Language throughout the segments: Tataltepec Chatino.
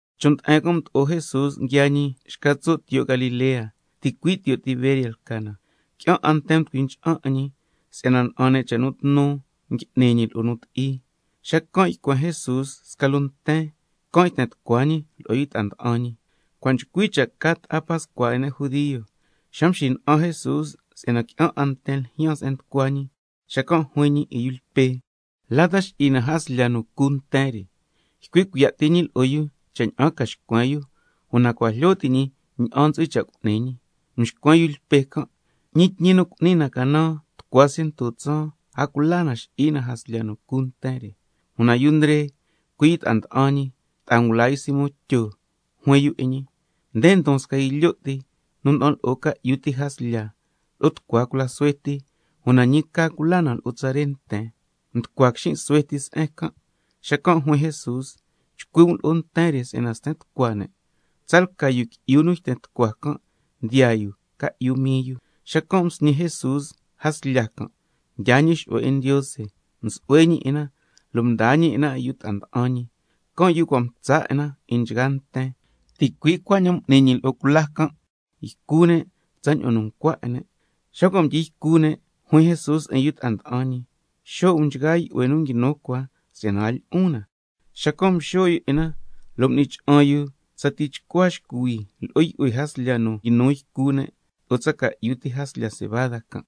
Chon' nde'en can' mdo'o Jesús nguiaa ñi xca tso' tiyo' Galilea, ticui' tiyo' Tiberias lca na. Qui'an 'a nten nducui ncha'an 'in ñi si'yana na'an ne' cha' nu tnu ngui'ni ñi lo'o nu ti'i. Xacan' ycuen Jesús sca loo nten, can' yten tucua ñi lo'o yu ta'a nda'an ñi. Cua' nchcui cha' ca ta'a pascua 'in ne' judio. Xa mxina'an Jesús si'yana qui'an 'a nten ljyaan se'en nducua ñi, xacan' juin ñi 'in yu Lpe: ¿La ta xi'i na jaslya nu cu nten re? Ycui' cuiya' ti ñi lo'o yu cha' ña'an ca xcuen yu, una cua' jlyo ti' ñi ña'an ntsu'hui cha' cu'ni ñi. Mxcuen yu Lpe can': Ñi tñi nu cu'ni na canan tucua ciento tsaan, a cula na xi'i na jaslya nu cu nten re. Una yu Ndre, cui' ta'a nda'an ñi, ta'a ngula yu Simón Tyo, juin yu 'in ñi: Nde ndon sca yu lyo' ti nu nda'an lo'o ca'yu ti jaslya lo'o tucua cula suhue ti. Una ñi ca cula na lo'o tsare nten. Nducua quixin' xuhue ti se'en can'. Xacan' juin Jesús: Chcui' um lo'o nten re si'yana sten tucua ne'. Tsalca yu qui'yu nu yten tucua can' ndiyaa yu ca'yu mii yu. Xacan' msñi Jesús jaslya can', mdyaa ñi xu'hue 'in Ndiose, msu'hue ñi 'in na lo' mdaa ñi 'in na 'in yu ta'a nda'an ñi, can' yu nu cua' mtsa 'in na 'in nchgaa nten. Ticui' cuaña'an m'ni ñi lo'o cula can', ycu ne' tsaña'an nu ncua 'in ne'. Xa cua' mdyi ycu ne' juin Jesús 'in yu ta'a nda'an ñi: Xo' um nchgaa yu'hue nu nguinu cua si'yana a lyi'un na. Xacan' mxo' yu 'in na, lo' m'ni cha'an yu tsa tichcua xcuhui lo'o yu'hue jaslya nu nguinu ycu ne' loo tsa ca'yu ti jaslya cebada can'.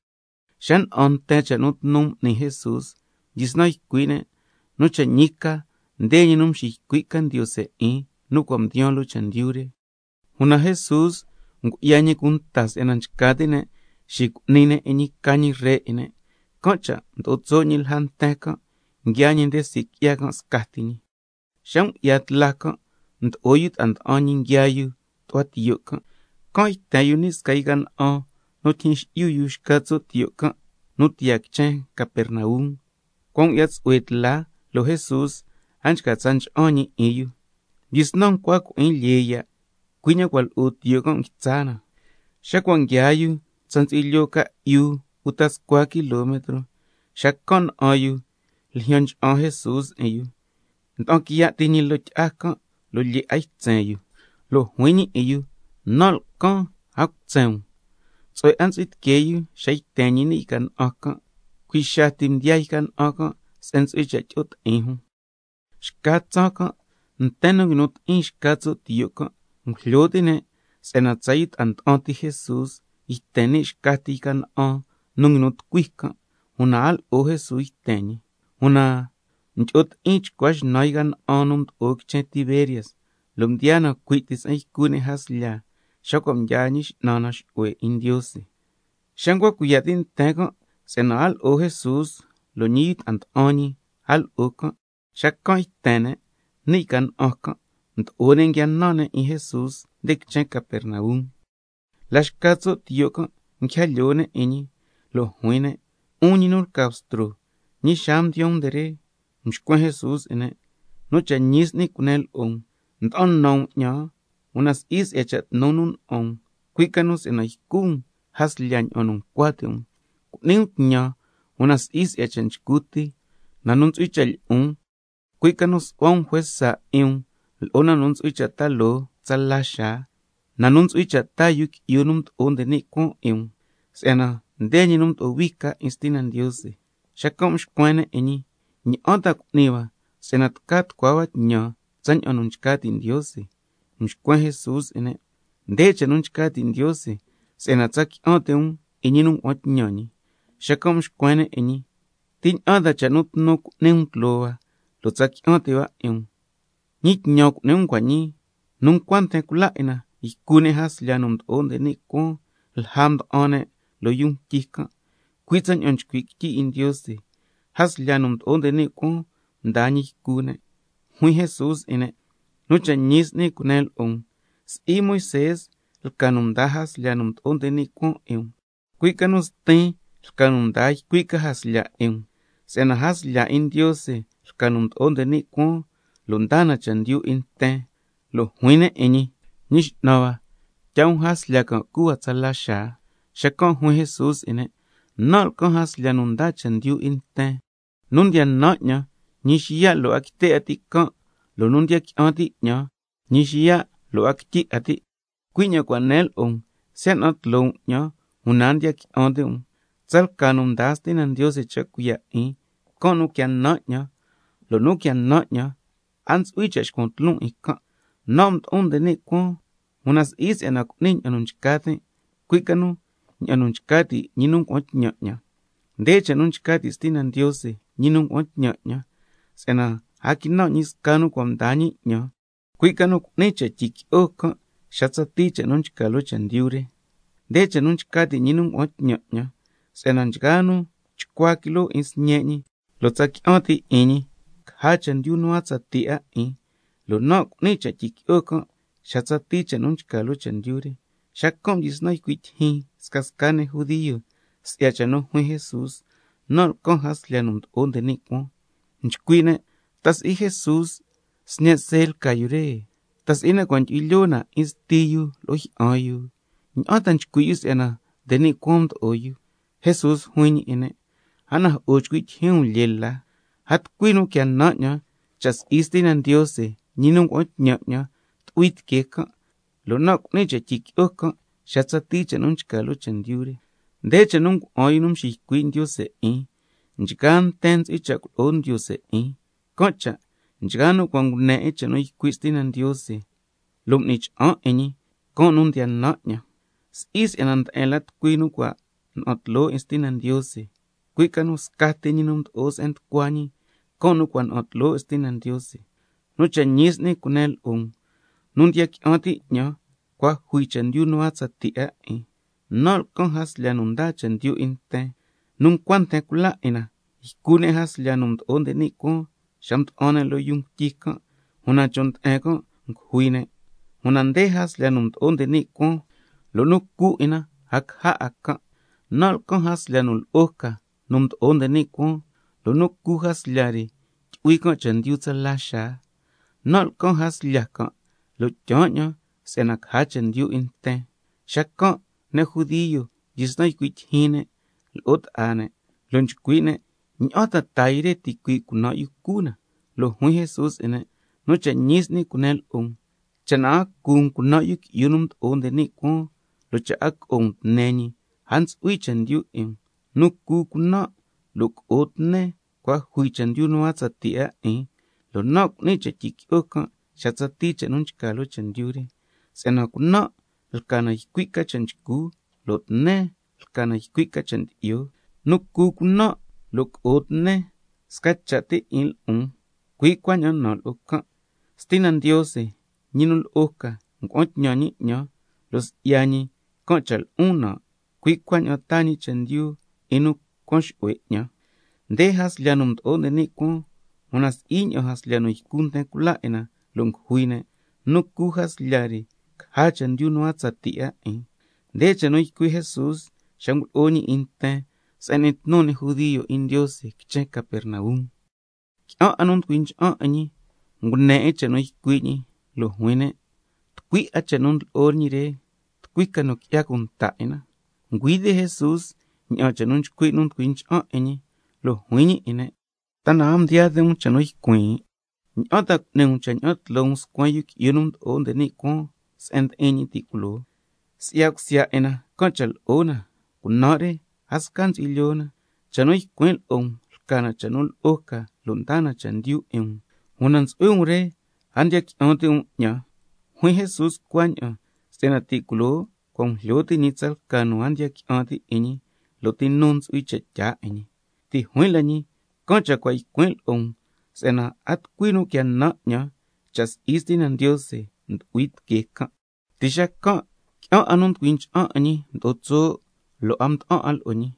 Xa na'an nten can' cha' nu tnu m'ni Jesús, mdyisnan ycui' ne': Nu cha' ñi ca, nde ñi nu nxiycui' ca Ndiose 'in, nu cua' mdiyaan loo chendyu re. Una Jesús ngu'ya ñi cunta si'yana nchca ti' ne' xicu'ni ne' 'in ñi nu ca ñi ree 'in ne', can' cha' mdo'o tso' ñi lja nten can', lo' nguiaa ñi nde sii' qui'ya can' scati ñi. Xa ngu'ya tla can' mdo'o yu ta'a nda'an ñi nguiaa yu tu'hua tiyo' can'. Can' yten yu ni' sca yca na'an nu tyijyin xi'yu yu xca tso' tiyo' can' nu tiyaa yu quichen Capernaum. Cua' ngu'ya tsu'hue tla, lo' Jesús a nchca tsa ncha'an ñi 'in yu. Mdyisnan ncua cui'in lyee ya', cui' ña'aan cua' lo'o tiyo' can' mdyisnan nguitsa na. Xa cua' nguiaa yu tsa ntsu'hui lyoo ca'yu uta scua kilometro, xacan' na'an yu ljyan ncha'an Jesús 'in yu, nda'an quiya' ti ñi loo tyi'a can', lo' lyee 'a ytsen yu. Lo' juin ñi 'in yu: Nan' lcan, a cutsen um. Tsu'hue 'a ntsu'hui tiquee yu xa yten ñi ni' yca na'an can', cui' xaa ti mdiyaa yca na'an can' se'en ntsu'hui cha' tyi'o ti'in jun. Xca tsaan can' nten nu nguinu ti'in xca tso' tiyo' can', ngujlyo ti' ne' si'yana tsa yu ta'a nda'an ti Jesús yten ni' xca ti yca na'an nu nguinu nducui can', una a lo'o Jesús yten ñi. Una mdyi'o ti'in chcua xnan yca na'an nu mdo'o quichen Tiberias, lo' mdiyaa na cui' ti se'en ycu ne' jaslya xa cua' mdyaa Ñi X'nan na xu'hue 'in Ndiose. Xa ncua cuiya' ti' nten can' si'yana a lo'o Jesús, lo' ñi yu ta'a nda'an ñi a lo'o can', xacan' yten ne' ni' yca na'an can', mdo'o ne' nguia nan ne' 'in Jesús nde quichen Capernaum. La xca tso' tiyo' can' nguija lyoo ne' 'in ñi, lo' juin ne': 'Un ñi nu lca Bstro, ¿ñi xaa mdiyaan um nde re? Mxcuen Jesús 'in ne': Nu cha' ñi s'ni cunen lo'o um, nda'an nan um 'ñan, una si'i si'ya cha' nu tnu nu na'an um, cui' ca nu si'yana ycu um jaslya ña'an nu ncua ti' um. Cu'ni um tñan, una si'i si'ya cha' nchcu ti, na nu ntsu'hui cha' lyi'un, cui' ca nu su'hua um juesa 'in um lo'o na nu ntsu'hui cha' ta loo tsala xaa, na nu ntsu'hui cha' taa Yu Qui'yu nu Mdo'o nde ni' Cuaan 'in um, si'yana nde ñi nu mdo'o hui ca 'in Stina Ndiose. Xacan' mxcuen ne' 'in ñi: ¿Ña'an ta cu'ni hua si'yana tca tucua hua tñan tsaña'an nu nchca ti' Ndiose? Mxcuen Jesús 'in ne': Nde cha' nu nchca ti' Ndiose, si'yana tsa qui'an ti' um 'in nu ngua'an tñan ñi. Xacan' mxcuen ne' 'in ñi: ¿Ti ña'an ta cha' nu tnu cu'ni um tloo hua, lo' tsa qui'an ti' hua 'in um? ¿Ñi tñan cu'ni um cua' ñii? Nu ncua nten cula 'in na ycu ne' jaslya nu mdo'o nde ni' cuaan lja nu mda'an ne' loo yuu ngutyi can', cui' tsaña'an nchcui' quityi 'in Ndiose: —Jaslya nu mdo'o nde ni' cuaan mdaa ñi ycu ne'—. Juin Jesús 'in ne': Nu cha' ñi s'ni cunen lo'o um, si'i Moisé lca nu mdaa jaslya nu mdo'o nde ni' cuaan 'in um, cui' ca nu Stin lca nu ndaa ycui' ca jaslya 'in um. Si'yana jaslya 'in Ndiose lca nu mdo'o nde ni' cuaan lo' ndaa na chendyu 'in nten. Lo' juin ne' 'in ñi: Ñi X'nan hua, tyaa um jaslya can' cu hua tsala xaa. Xacan' juin Jesús 'in ne': Nan' lcan jaslya nu ndaa chendyu 'in nten. Nu ndiya nan 'ñan, ñi xiya' lo' 'a quite' 'a ti' can', lo' nu ndiya qui'an ti' 'ñan, ñi xiya' lo' a quityi 'a ti'. Cui' ña'an cua' nen lo'o um, siya' na'an tloo um 'ñan una a ndiya qui'an ti' um. Si'yana tsalca nu ndaa Stina Ndiose cha cuiya' 'in, can' nu quia nan 'ñan, lo' nu quia nan 'ñan a ntsu'hui cha' xcuan tloon 'in can'. Nan' mdo'on nde ni' cuaan, una si'i si'yana cu'nin ña'an nu nchca tin', cui' ca nu ña'an nu nchca ti' ñi nu ngua'an tñan 'ñan. Nde cha' nu nchca ti' Stina Ndiose, ñi nu ngua'an tñan 'ñan, si'yana a quinan' ñi sca nu cua' mdaa ñi 'ñan, cui' ca nu cu'nin cha' tyiqui'o can' xa tsatii cha' nu nchca loo chendyu re. Nde cha' nu nchca ti' ñi nu ngua'an tñan 'ñan, si'yana nchgaa nu chcua quiloo 'in Sñe' ñi lo' tsa qui'an ti' 'in ñi, caja chendyu nu a tsatii 'a 'in, lo' nan' cu'nin cha' tyiqui'o can' xa tsatii cha' nu nchca loo chendyu re. Xacan' mdyisnan ycui' tyijyin scasca ne' judio si'ya cha' nu juin Jesús: Nan' lcan jaslya nu mdo'o nde ni' cuaan. Nchcui' ne': ¿Ta si'i Jesús sñe' See lca yu re, ta si'i na cua' ndyu'hui lyoo na 'in sti yu lo'o jyi'an yu? ¿Ña'an ta nchcui' yu si'yana nde ni' cuaan mdo'o yu? Jesús juin ñi 'in ne': A najo'o chcui' tyijyin um lyee la. A tucui nu quia nan 'ñan cha' si'i Stina Ndiose, ñi nu ngua'an tñan 'ñan, tu'hui tiquee can', lo' nan' cu'nin cha' tyiqui'o can' xa tsatii cha' nu nchca loo chendyu re. Nde cha' nu ngua'an yu nu mxiycui' Ndiose 'in: —Nchgaa nten ntsu'hui cha' culo'o Ndiose 'in—. Can' cha' nchgaa nu cua' ngune 'in cha' nu ycui' Stina Ndiose lo' m'ni cha'an 'in ñi, can' nu ndiya nan 'ñan. Si'i si'yana nde'en la tucui nu cua' na'an tloo 'in Stina Ndiose, cui' ca nu scati ñi nu mdo'o se'en nducua ñi, can' nu cua' na'an tloo 'in Stina Ndiose. Nu cha' ñi s'ni cunen lo'o um, nu ndiya qui'an ti' 'ñan cua' jui chendyu nu a tsatii 'a 'in. Nan' lcan jaslya nu ndaa chendyu 'in nten. Nu ncua nten cula 'in na ycu ne' jaslya nu mdo'o nde ni' cuaan xa mda'an ne' loo yuu ngutyi can', una chon' nde'en can' ngujui ne'. Una nde jaslya nu mdo'o nde ni' cuaan, lo' nu cu 'in na, a caja 'a can'. Nan' lcan jaslya nu lo'o ca nu mdo'o nde ni' cuaan, lo' nu cu jaslya re tyu'hui can' chendyu tsala xaa. Nan' lcan jaslya can', lo' tyaan 'ñan si'yana caja chendyu 'in nten. Xacan' ne' judio mdyisnan nchcui' tyijyin ne' lo'o ta'a ne', lo' nchcui' ne': ¿Ña'an ta tca taa yu re ticuii' cunan' yu cu na? Lo' juin Jesús 'in ne': Nu cha' ñi s'ni cunen lo'o um, cha' na a cu um cunan' Yu Qui'yu nu Mdo'o nde ni' Cuaan, lo' cha' a co'o um tne yu, a ntsu'hui chendyu 'in um. Nu cu cunan' lo' co'o tnen, cua' jui chendyu nu a tsatii 'a 'in, lo' nan' cu'nin cha' tyiqui'o can' xa tsatii cha' nu nchca loo chendyu re. Si'yana cunan' lca na ycui' ca cha' nchcu, lo' tnen lca na ycui' ca cha' ndyi'o. Nu cu cunan' lo' co'o tnen, sca cha' ti 'in lo'on, cui' cuaña'an nan' lo'o can'. Stina Ndiose, ñi nu lo'o ca, ngua'an tñan ñi 'ñan, lo' si'ya ñi can' cha' lo'on nan', cui' cuaña'an taan chendyu 'in nu cuan xu'hue 'ñan. Nde jaslya nu mdo'o nde ni' cuaan, una si'i ña'an jaslya nu ycu nten cula 'in na lo' ngujui ne', nu cu jaslya re caja chendyu nu a tsatii 'a 'in. Nde cha' nu ycui' Jesús xa ngulo'o ñi 'in nten se'en ndiyo' ti'in ne' judio quichen Capernaum. Qui'an 'a nu nducui ncha'an 'in ñi ngune 'in cha' nu ycui' ñi, lo' juin ne': Tucui 'a cha' nu ndlo'o ñi re. ¿Tucui ca nu qui'ya cunta 'in na? Ngüi ti' Jesús ña'an cha' nu nchcui' nu nducui ncha'an 'in ñi, lo' juin ñi 'in ne': ¿Ta na a mdiyaa ti' um cha' nu ycuin'? ¿Ña'an ta cu'ni um cha' ña'an tloo um scuen Yu Qui'yu nu Mdo'o nde ni' Cuaan se'en ndi'in ñi ti' culoo? Si'ya cusya 'in na can' cha' lo'o na, cunan' re a sca ntsu'hui lyoo na. Cha' nu ycuin' lo'o um lca na cha' nu lo'o ca lo' ndaa na chendyu 'in um. Una ntsu'hui um re a ndiya qui'an ti' um 'ñan. Juin Jesús cuaña'an si'yana ti' culoo cua' ngujlyo ti' ñi tsalca nu a ndiya qui'an ti' 'in ñi, lo' ti nu ntsu'hui cha' tyaa 'in ñi. Ti' juin la ñi: Can' cha' cua' ycuin' lo'o um si'yana a tucui nu quia nan 'ñan, cha' si'i Stina Ndiose ndu'hui tiquee can'. Ti' xacan' qui'an 'a nu nducui ncha'an 'in ñi mdo'o tso', lo' a mda'an 'a lo'o ñi.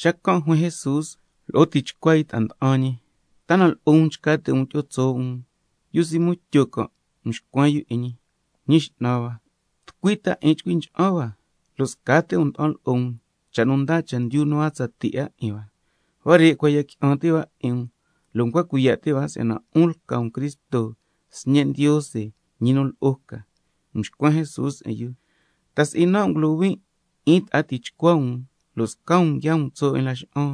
Xacan' juin Jesús lo'o tichcua yu ta'a nda'an ñi: ¿Ta na lo'o um nchca ti' um tyi'o tso' um? Yu Simón Tyo can' mxcuen yu 'in ñi: Ñi X'nan hua, ¿tucui ta 'in chcui ncha'an hua, lo' scati um nda'an lo'o um cha' nu ndaa chendyu nu a tsatii 'a 'in hua? Huare' cua' ya qui'an ti' hua 'in um, lo' ncua cuiya' ti' hua si'yana 'un lca um Cristo, Sñe' Ndiose, ñi nu lo'o ca. Mxcuen Jesús 'in yu: ¿Ta si'i nan' ngulohuin 'in ta'a tichcua um, lo' sca um nguiaa um tso' 'in laxa'an?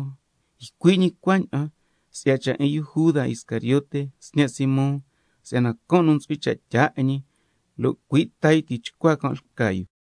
Ycui' ñi cuaña'an si'ya cha' 'in yu Juda Iscariote, sñe' Simón, si'yana can' nu ntsu'hui cha' tyaa 'in ñi, lo' cui' ta yu tichcua can' lca yu.